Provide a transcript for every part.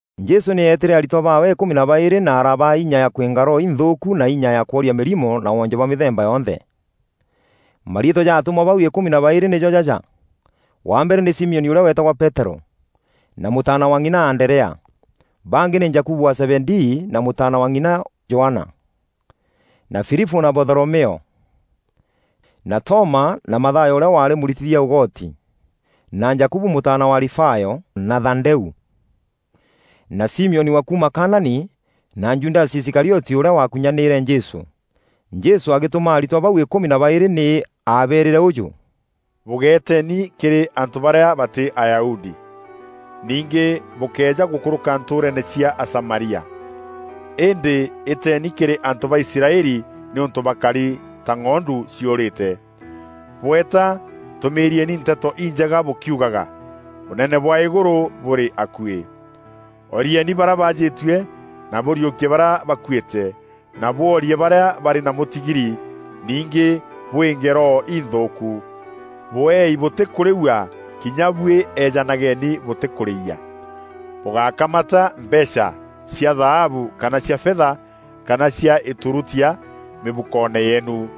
Jesû nî eetîre aritwa baawe îkûmi na baîrî na arabaa inya ya kwînga roho inthûûku na inya ya kworia mîrimo na woonje bwa mîthemba yonthe. Mariîtwa ja atûmwa bau îkûmi na baîrî nîjo jaja: Wa mbere nî Simioni ûrîa weetagwa Peterû, na mûtaana wa ng'ina Anderea. Bangî nî Jakubu wa Zebedii na mûtaana wa ng'ina wa Johana, na Filipû na Batholomeo, na Toma na Mathayo ûrîa waarî mûritithia ûgotî; na Jakubu mûtaana wa Alifayo, na Thadeû; na Simioni wa kuuma Kanaani na Judasi Iskarioti ûrîa waakunyanîîre Jesû. Jesû agîtûma atûmwa bau îkûmi na baîrî nî aabeerîre ûjû, “Bûgeeteni kîrî antû barîa batî Ayahudi. Ningî bûkéeja gûkûrûka ntûûreene cia Asamaria. Îndî îteeni kîrî antû ba Israeli nîûntû bakari ta ng'ondu ciûrîte. Bweeta tûmîriieni Nteto Injega bûkîugaga, ‘Ûnene bwa îgûrû bûrî akuî.’ Orieeni barîa baajîtue, na bûriûkie barîa bakuîte, na bwoorie barîa barî na mûtigiri, ningî bwînge roho inthûûku. Bweei bûtîkûrîua, kinya buî eejanageni bûtîkûrîia. Bûgákamata mbeecha cia thaabu kana cia fetha kana cia îturutia mîbukoone yeenu.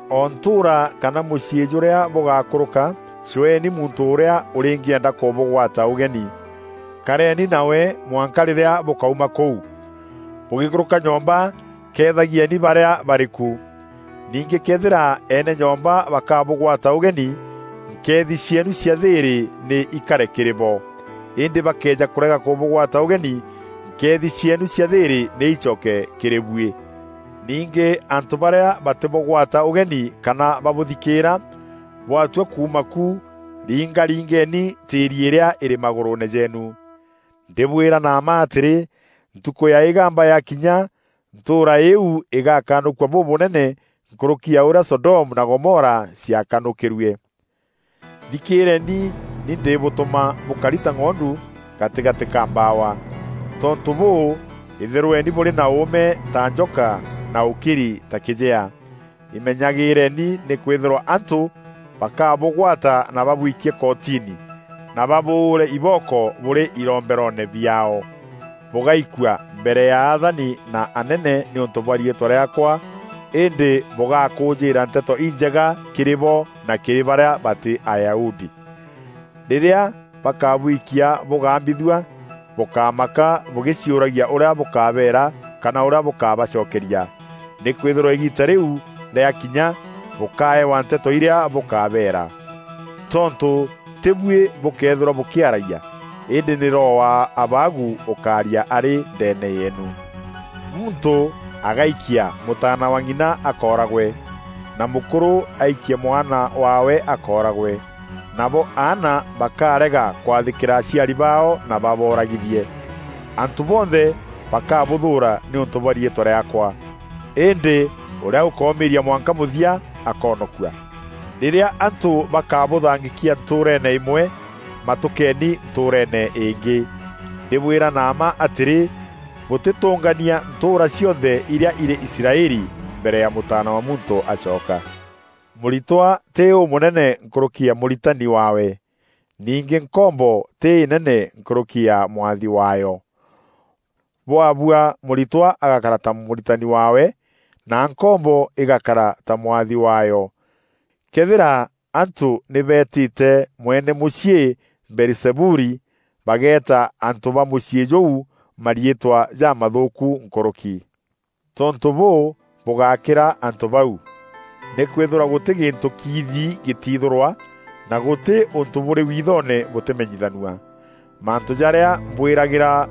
O ntûûra kana mûciî jûrîa bûgakûrûka, cweeni muntû ûrîa ûrîngîenda kûbûgwata ûgeni. Kareeni nawe mwanka rîrîa bûkauma kûu. Bûgîkûrûka nyomba keethagieni barîa barî ku. Ningî këethîra eene nyomba bakabûgwata ûgeni, nkeethi cieenu cia thîîrî nî ikare kîrî bo. Îndî bakëeja kûrega kûbûgwata ûgeni, nkeethi cieenu cia thîîrî nî icoke kîrî buî. Ningî antû barîa batîbûgwata ûgeni kana babûthikîîra, bwatua kuuma ku, ringaringeeni tîîri îrîa îrî magûrûûne jeenu. Ndîbwîra na mma atîrî, ntukû ya îgamba yakinya, ntûûra îîu îgakanûkua bûbûnene nkûrûki ya ûrîa Sodomu na Gomora ciakanûkîrue. “Thikîreeni, ni ndibûtûma bûkari ta ng'ondu gatîgatî ka mbawa. Tontû bûû, îthîrweni bûrî na ûûme ta njoka na ûkiri ta kîjea. Imenyagîreeni nîkwîthîrwa antû bakabûgwata na babwikie kotini na babûûre ibooko bûrî kîromberoone ciaao. Bûgaikua mbere ya athani na anene nîûntû bwa riîtwa rîaakwa îndî bûgakûûjîîra Nteto Injega kîrî bo na kîrî barîa batî Ayahudi. Rîrîa bakabwikia bûgambithua, bûkamaka bûgîciûragia ûrîa bûkabeera kana ûrîa bûkabacokeria, nîkwîthîrwa îgiita rîu rîakinya, bûkaewa nteto irîa bûkabeera. Tontû tî buî bûkeethîrwa bûkîaragia, îndî nî Roho wa Abaagu ûkaaria arî ndeene yeenu. Muntû agaikia mûtaana wa ng'ina akooragwe, na mûkûrû aikie mwana waawe akooragwe; nabo aana bakarega kwathîkîra aciari baao na baboragithie. Antû bonthe bakabûthûûra nîûntû bwa riîtwa rîaakwa. Îndî ûrîa ûkoomîîria mwanka mûthia, akoonokua. “Rîrîa antû bakabûthangîkia ntûûreene îmwe, matûkeeni ntûûreene îngî. Ndîbwîra na mma atîrî, bûtîtûngania ntûûra cionthe irîa irî Israeli mbere ya Mûtaana wa Muntû acoka. “Mûritwa tî ûmûnene nkûrûki ya mûritani waawe; ningî nkombo tî înene nkûrûki ya mwathi waayo. Bwabua mûritwa agakara ta mûritani waawe, na nkombo îgakara ta mwathi waayo. Këethîra antû nî beetîte mweene mûciî Beelizebuli, bageeta antû ba mûciî jûu mariîtwa jamathûûku nkûrûki.” “Tontû bûû, bûgákîra antû bau. Nîkwîthîrwa gûtî gîntû kiithi gîtiithûrwa, na gûtî ûntû bûrî wiithoone bûtîmenyithanua. Mantû jarîa mbwîragîra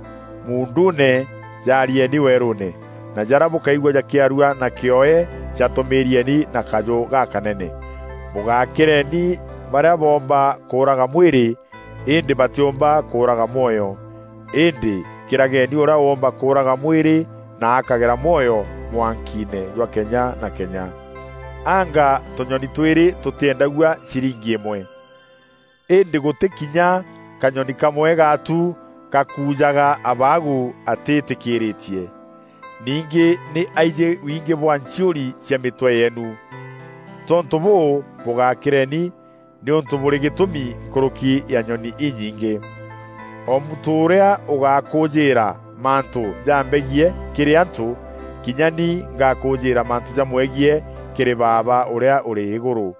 muunduune, jaarieni werûûne, na jarîa bûkaigua jakîarua na kîoe jatûmîîrieni na kaajû gakanene. Bûgakîreni barîa boomba kûûraga mwîrî îndî batîûmba kûûraga mwoyo. Îndî kîrageni ûrîa ûûmba kûûraga mwîrî na akagera mwoyo mwankiine jwa kenya na kenya. Anga tûnyoni twîrî tûtîendagua ciringi îmwe. Îndî gûtî kinya kanyoni kamwe gaatu gakujaga Abaagu atîtîkîîrîtie. Ningî nî aijî wingî bwa nchiûri cia mîtwe yeenu. Tontû bûû, bûgakîreni, nîûntû bûrî gîtûmi nkûrûki ya nyoni inyingî.” “O muntû ûrîa ûgakûûjîîra mantû jambegiî kîrî antû, kinya ni ngakûjîîra mantû jamwegiî kîrî Baaba ûrîa ûrî îgûrû.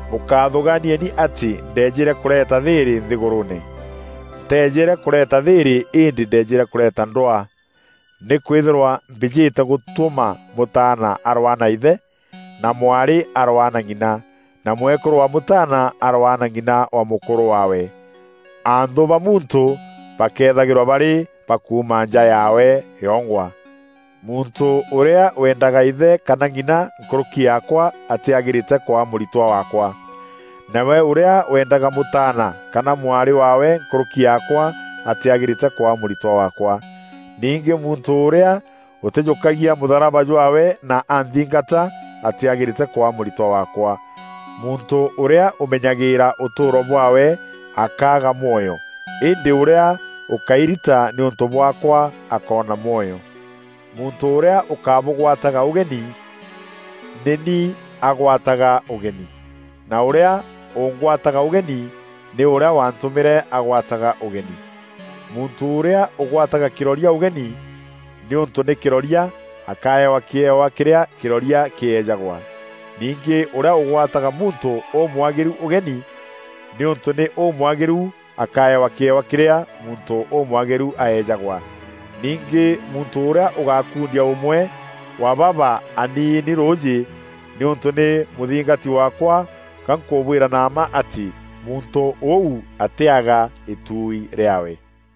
“Bûkathûgaanieni atî ndeejîre kûreeta thîîrî nthîgûrûûne. Nteejîre kûreeta thîîrî îndî ndeejîre kûreeta ndwaa. Nîkwîthîrwa mbîjîte gûtûma mûtaana arwaa na îthe, na mwarî arwaa na ng'ina, na mwekûrû wa Mûtaana arwaa na ng'ina wa mûkûrû waawe. Anthû ba muntû bakethagîrwa barî bakuuma nja yaawe yongwa. Muntû ûrîa weendaga îthe kana ng'ina nkûrûki yaakwa atîagîrîte kwaa mûritwa waakwa. Nawe ûrîa weendaga mûtaana kana mwarî waawe nkûrûki yaakwa atîagîrîte kwaa mûritwa waakwa. Ningî muntû ûrîa ûtîjûkagia mûtharaba jwaawe na anthingata, atîagîrîte kwaa mûritwa waakwa. Muntû ûrîa ûmenyagîra ûtûûro bwaawe akaaga mwoyo, îndî ûrîa ûkairita nîûntû bwaakwa akoona mwoyo.” “Muntû ûrîa ûkabûgwataga ûgeni, nî ni agwataga ûgeni na ûrîa ûngwataga ûgeni nî ûrîa wantûmîre agwataga ûgeni. Muntû ûrîa ûgwataga kîroria ûgeni, nîûntû nî kîroria, akaewa kîewa kîrîa kîroria kîejagwa. Ningî ûrîa ûgwataga muntû ûmwagîru ûgeni, nîûntû nî ûmwagîru, akaewa kîewa kîrîa muntû ûmwagîru aejagwa. Ningî muntû ûrîa ûgakundia ûmwe wa baba aniini rûûjî, nîûntû nî mûthingati waakwa, gankûbwîra na mma atî, muntû ûu atîaga îtuui rîaawe.”